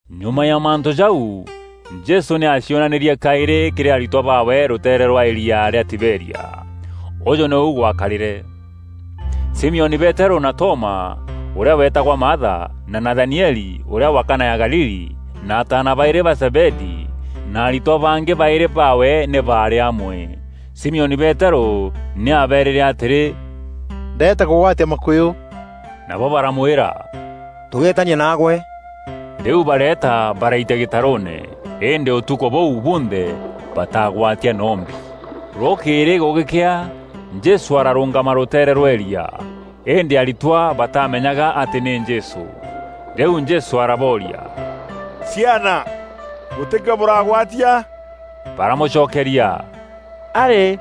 Nyuma ya mantû jau, Jesû nî aacionanîrie kaîrî kîrî aritwa baawe rûteere rwa îria rîa Tiberia. Ûjû nîu gwakarîre: Simioni Peterû na Toma, ûrîa weetagwa Maatha, na Nathanieli, ûrîa wa Kana ya Galili, na ataana baîrî ba Zebedii, na aritwa bangî baîrî baawe nî baarî amwe. Simioni Peterû nî abeerîre atîrî, “Ndeeta kûgwatia makûyû.” Nabo baramwîra, “Tûgeetania naagwe.” Rîu bareeta baraitia gîtarûûne, îndî ûtukû bûu bunthe bataagwatia noo mbi. Rûkîîrî gûgîkea, Jesû ararûûngama rûteere rwa îria, îndî aritwa bataamenyaga atî nî Jesû. Rîu Jesû arabooria, “Ciana, gûtî kîo bûragwatia?” Baramûcokeria, “Arî,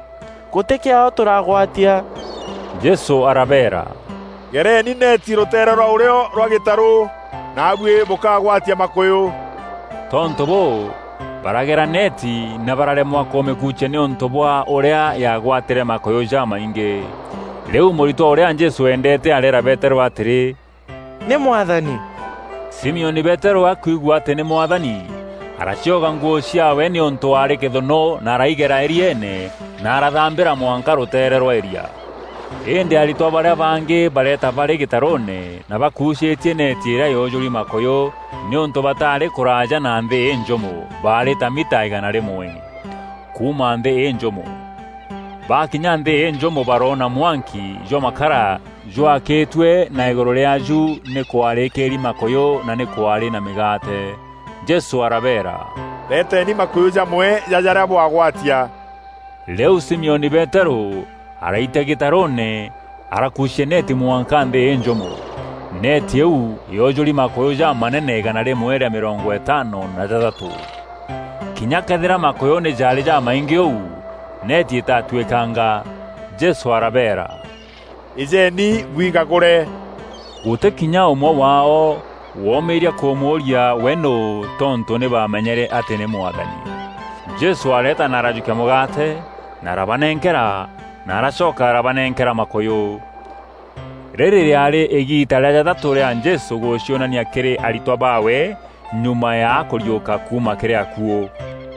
gûtî kîo tûragwatia.” Jesû arabeera, “Gereni neeti rûteere rwa ûrîo rwa gîtarû, naabuî bûkaagwatia makûyû.” Tontû bûû, baragera neeti na bararemwa kûmîkuucia nîûntû bwa ûrîa yaagwatîrie makûyû jamaingî. Rîu mûritwa ûrîa Jesû eendeete areera Peterû atîrî, “Nî Mwathani!” Simioni Peterû akwigua atî nî Mwathani, aracioga nguû ciaawe nîûntû aarî kîthûnû na araigera îrieene na arathambîra mwanka rûteere rwa îrîa. Îndî aritwa barîa bangî bareeta barî gîtarûûne na bakucîîtie neeti îrîa yoojûri makûyû nîûntû bataarî kûraaja na nthî înjûmo, baarî ta mita îgana rîmwe (100m) kuuma nthî înjûmo. Baakinya nthî înjûmo baroona mwanki jwa makara jwaakîtue na îgûrû rîaaju nî kwarîkîîri makûyû na nî kwaarî na mîgaate. Jesû arabeera, “Reeteeni makûyû jamwe ja jarîa bwagwatia.” Rîu Simioni Peterû araitia gîtarûûne arakuucia neeti mwanka nthî înjûmo. Neeti îîu yoojûri makûyû jamanene îgana rîmwe rîa mîrongo îtaano na jathatû. Kinya këethîra makûyû nî jaarî jamaingî ûu, neeti îtaatwîkanga. Jesû arabeera, “Îjeeni bwigagûre.” Gûtî kinya ûmwe waao woomîîria kûmûûria we nûû tontû nî baamenyere atî nî Mwathani. Jesû areeta na arajûkia mûgaate na arabanenkera na aracoka arabanenkera makûyû. Rîrî rîaarî îgiita rîa jathatû rîa Jesû gûcionania kîrî aritwa baawe nyuma ya akûriûka kuuma kîrî akuû.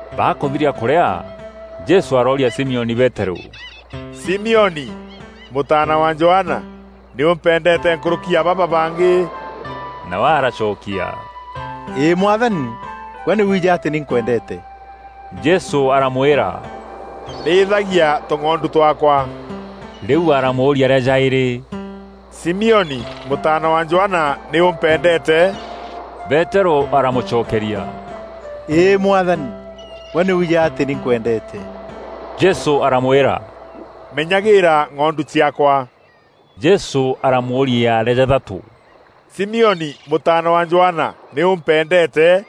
Bakûthiria kûrîa, Jesû arooria Simioni Peterû, “Simioni, mûtaana wa Johana! Nî ûmpendeete nkûrûki ya baba bangî.” Nawe aracokia, “Îî Mwathani, gwe nî wiijî atî nî nkwendeete.” Jesû aramwîra, “Rîîthagia tûng'ondu twaakwa.” Rîu aramûûria rîa jaîrî, “Simioni, mûtaana wa Johana nî ûmpendeete?” Peterû aramûcokeria, “Îî Mwathani, gwe nî wiijî atî nî nkwendeete.” Jesû aramwîra, “Menyagîîra ng'ondu ciaakwa.” Jesû aramûûria rîa jathatû, “Simioni, mûtaana wa Johana, nî ûmpendeete?”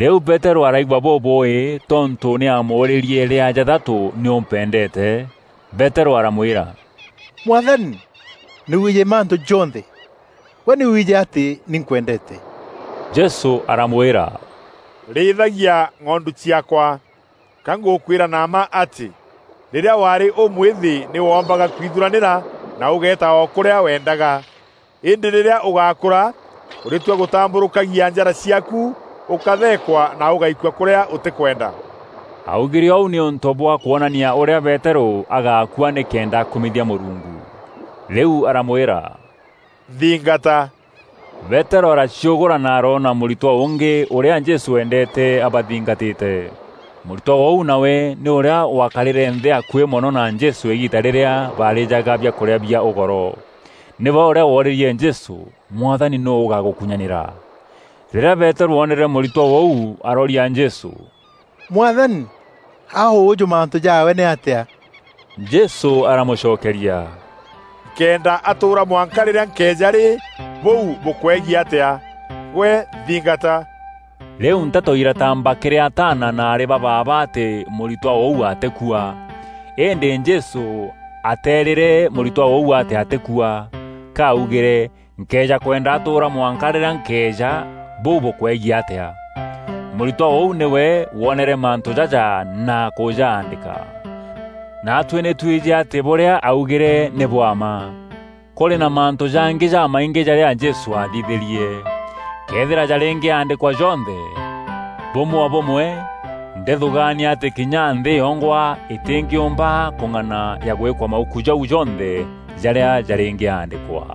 Rîu Peterû araigua bûbûûî tontû nî aamûûrîrie rîa jathatû, “Nî ûmpendeete?” Peterû aramwîra, “Mwathani, nî wiijî mantû jonthe. Gwe nî wiijî atî nî nkwendeete.” Jesû aramwîra, “Rîîthagia ng'ondu ciaakwa. Ka ngûkwîra na mma atî, rîrîa waarî ûmwîthî nî wombaga kwithuranîra na ûgeeta o kûrîa weendaga. Îndî rîrîa ûgakûra ûrîtua gûtambûrûkagia njara ciaaku ûkatheekwa na ûgaikua kûrîa ûtîkwenda.” Aaugîre ûu nîûntû bwa kwonania ûrîa Peterû agaakua nîkenda akumithia Mûrungu. Rîu aramwîra, “Nthingata.” Peterû araciûgûra na aroona mûritwa ûngî, ûrîa Jesû eendeete, abathingatîte. Mûritwa ûu nawe nî ûrîa waakarîre nthî akuî mono na Jesû îgiita rîrîa baarîjaga biakûrîa bia ûgoro. Nîwe ûrîa woorîrie Jesû, “Mwathani, nûû ûgagûkunyanîra?” Rîrîa Peterû oonere mûritwa ûu arooria Jesû, “Mwathani, a ûûjû mantû jaawe nîatîa?” Jesû aramûcokeria, “Nkëenda atûûra mwanka rîrîa nkeeja rî, bûu bûkwegie atîa? Gwe nthingata!” Rîu nteto irataamba kîrî ataana na aarî ba baaba atî mûritwa ûu atîkua. Îndî Jesû ateerîre mûritwa ûu atî atîkua, ka augîre, “Nkëeja kwenda atûûra mwanka rîrîa nkeeja, bûu bûkwegiî atîa?” Mûritwa ûu nîwe woonere mantû jaja na kûjaandîka. Naatuî nî twijî atî bûrîa aaugîre nî bwa mma. Kûrî na mantû jangî jamaingî jarîa Jesû aathithîrie. Këethîra jarîngîaandîkwa jonthe, bûmwe o bûmwe, ndîthûgaania atî kinya nthî yongwa îtîngîûmba kûng'ana ya gwîka mauku jau jonthe jarîa jarîngîaandîkwa.